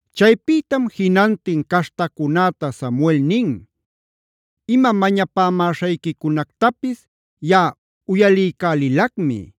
Chaypïtam jinantin caśhtacunäta Samuel nin: “Ima mañapämäśhayquicunactapis yaꞌa uyaliycälilacmi.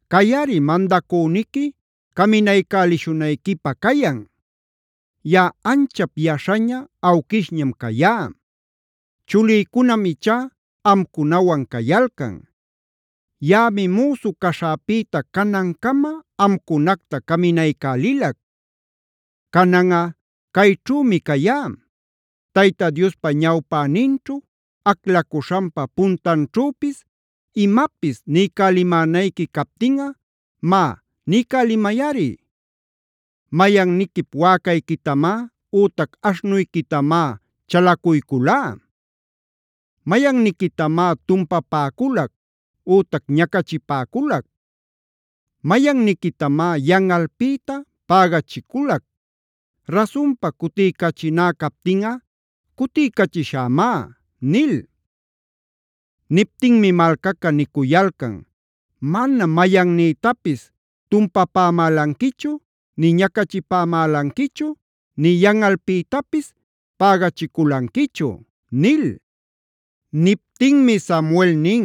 Cayꞌari mandacüniqui caminaycälishunayquipä cayan. Yaꞌa anchap yaśhaña, awquishñam cayá. Chulïcunam ichá amcunawan cayalcan. Yaꞌami müsu caśhäpïta canancama amcunacta caminaycälilac. Cananꞌa cayćhümi cayá. Tayta Diospa ñawpäninćhu, aclacuśhanpa puntanćhüpis imapis niycälimänayqui captinꞌa má niycälimayꞌari. ¿Mayanniquip wäcayquitamá ütac aśhnuyquitamá chalacuyculá? ¿Mayanniquitamá tumpapäculac ütac ñacachipäculac? ¿Mayanniquitamá yanꞌalpïta pägachiculac? Rasunpa cutiycachiná captinꞌa cutiycachishämá” nil. Niptinmi malcaca nicuyalcan: “Manam mayannïtapis tumpapämälanquichu nï ñacachipämälanquichu, nï yanꞌalpïtapis pägachiculanquichu” nil. Niptinmi Samuel nin: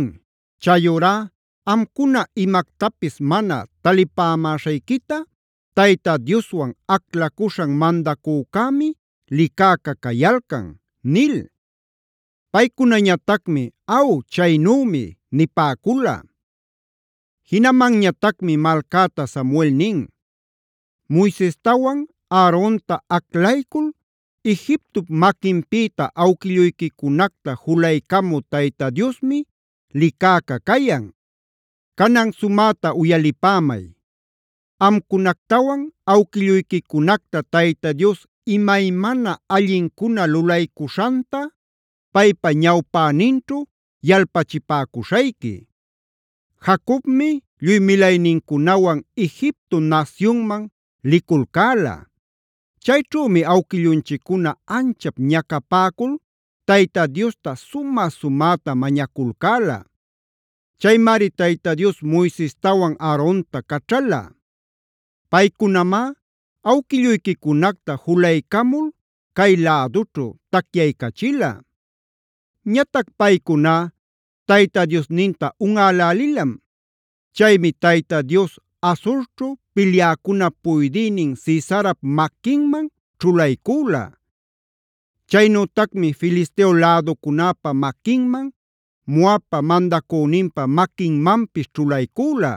“Chayurá amcuna imactapis mana talipämäśhayquita Tayta Dioswan aclacuśhan mandacücämi licäcä cayalcan” nil. Paycunañatacmi: “Aw chaynümi” nipäcula. Jinamanñatacmi malcäta Samuel nin: “Moisestawan Aarontaa aclaycul Egiptop maquinpïta awquilluyquicunacta julaycamü Tayta Diosmi licäcä cayan. Canan sumäta uyalipämay. Amcunactawan awquilluyquicunacta Tayta Dios imaymana allincuna lulaycuśhanta paypa ñawpäninćhu yalpachipäcuśhayqui. Jacobmi lluy milaynincunawan Egipto nasyunman liculcäla. Chayćhümi awquillunchiccuna anchap ñacapäcul Tayta Diosta sumä-sumäta mañaculcäla.b Chaymari Tayta Dios Moisestawan Aaronta caćhala. Paycunamá awquilluyquicunacta julaycamul cay lädućhu tacyaycachila. Ñatac paycuná Tayta Diosninta unꞌälälilam. Chaymi Tayta Dios Hazorćhu pilyäcunap puydïnin Sisarapc maquinman ćhulaycüla; chaynütacmi Filisteo läducunäpad maquinman, Moabpae mandacüninpa maquinmanpis ćhulaycüla.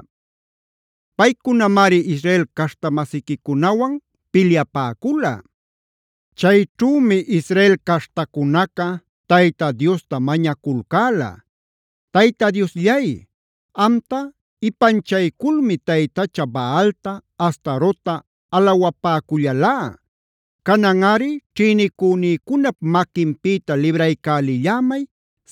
Paycunamari Israel caśhta-masiquicunawan pilyapäcula. Chayćhümi Israel caśhtacunaca Tayta Diosta mañaculcäla: ‘Tayta Diosllay, amta ipanchayculmi taytacha Baalta, Astarotta alawapäcullalá. Cananꞌari ćhïnicünïcunap maquinpïta libraycälillämay,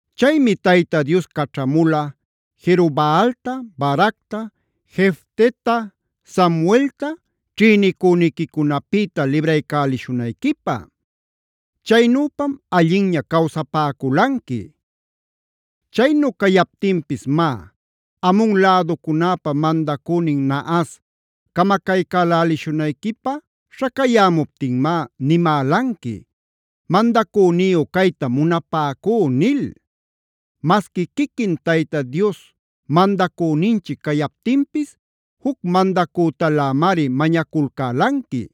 “Chaymi Tayta Dios caćhamula Jerobaalta,g Baracta,h Jefteta,i Samueltaj ćhïnicüniquicunapïta libraycälishunayquipä. Chaynüpam allinña cawsapäculanqui. Chaynu cayaptinpis má, Amon läducunäpa mandacünin Nahas camacaycälälishunayquipä śhacayämuptinmá nimälanqui: ‘Mandacüniyu caytam munapäcú’ nil.k Masqui quiquin Tayta Dios mandacüninchic cayaptinpis juc mandacütalämari mañaculcälanqui.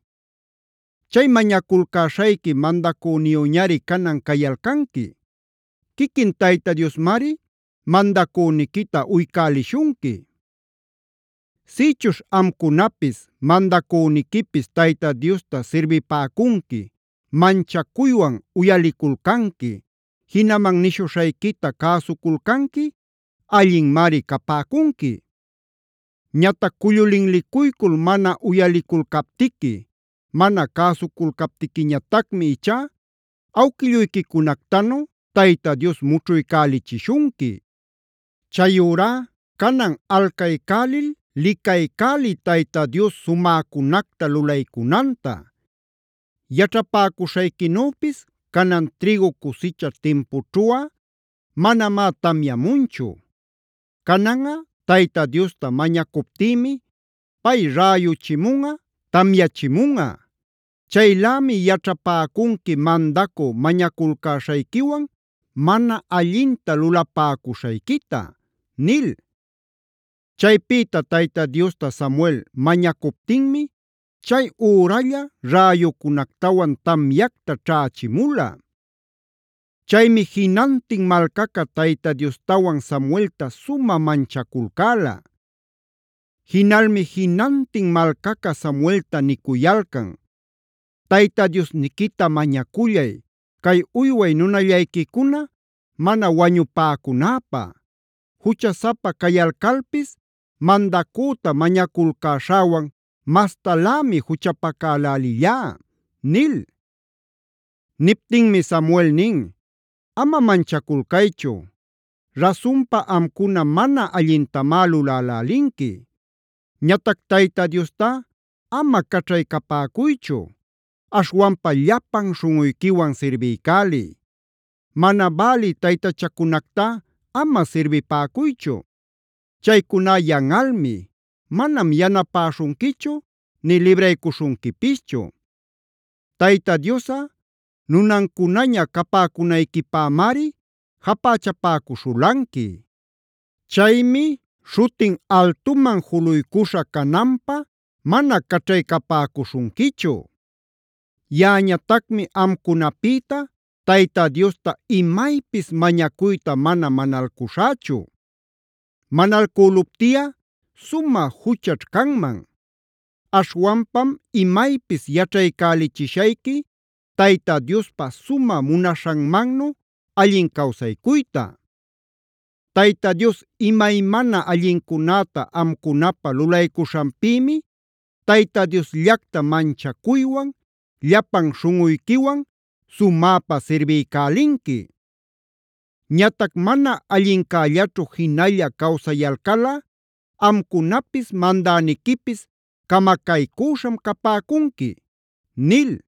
Chay mañaculcäśhayqui mandacüniyüñari canan cayalcanqui. Quiquin Tayta Diosmari mandacüniquita uycäliśhunqui. Sïchuśh amcunapis, mandacüniquipis Tayta Diosta sirbipäcunqui, manchacuywan uyaliculcanqui, jinaman nishuśhayquita cäsuculcanqui allinmari capäcunqui. Ñatac cullu linlicuycul mana uyaliculcaptiqui, mana cäsuculcaptiquiñatacmi ichá awquilluyquicunactanu Tayta Dios mućhuycälichishunqui. “Chayurá canan alcaycälil licaycäliy Tayta Dios sumäcunacta lulaycunanta. Yaćhapäcuśhayquinüpis canan trïgu cusicha timpućhuꞌa manamá tamyamunchu. Cananꞌa Tayta Diosta mañacuptïmi pay räyuchimunꞌa, tamyachimunꞌa. Chaylämi yaćhapäcunqui mandacü mañaculcäśhayquiwan mana allinta lulapäcuśhayquita” nil. Chaypïta Tayta Diosta Samuel mañacuptinmi chay üralla räyucunactawan tamyacta ćhächimula. Chaymi jinantin malcaca Tayta Diostawan Samuelta sumä manchaculcäla. Jinalmi jinantin malcaca Samuelta nicuyalcan: “Tayta Diosniquita mañacullay cay uyway nunallayquicuna mana wañupäcunäpä. Juchasapa cayalcalpis mandacüta mañaculcäśhäwan mastalämi juchapacälälillá” nil. Niptinmi Samuel nin: “Ama manchaculcaychu. Rasunpa amcuna mana allintamá lulälälinqui. Ñatac Tayta Diostá ama caćhaycapäcuychu; aśhwanpa llapan śhunꞌuyquiwan sirbiycäliy. Mana bälï taytachacunactá ama sirbipäcuychu. Chaycuná yanꞌalmi; manam yanapäśhunquichu nï libraycuśhunquipischu. Tayta Diosꞌa nunancunaña capäcunayquipämari japächapäcuśhulanqui. Chaymi śhutin altuman juluycuśha cananpä mana caćhaycapäcuśhunquichu. Yaꞌañatacmi amcunapïta Tayta Diosta imaypis mañacuyta mana manalcuśhächu. Manalcüluptiꞌa sumä juchaćh canman. Aśhwanpam imaypis yaćhaycälichishayqui Tayta Diospa sumä munaśhanmannu allin cawsaycuyta. Tayta Dios imaymana allincunäta amcunapä lulaycuśhanpïmi Tayta Diosllacta manchacuywan, llapan śhunꞌuyquiwan sumäpa sirbiycälinqui. Ñatac mana allincällaćhu jinalla cawsayalcalꞌa amcunapis mandäniquipis camacaycüśham capäcunqui” nil.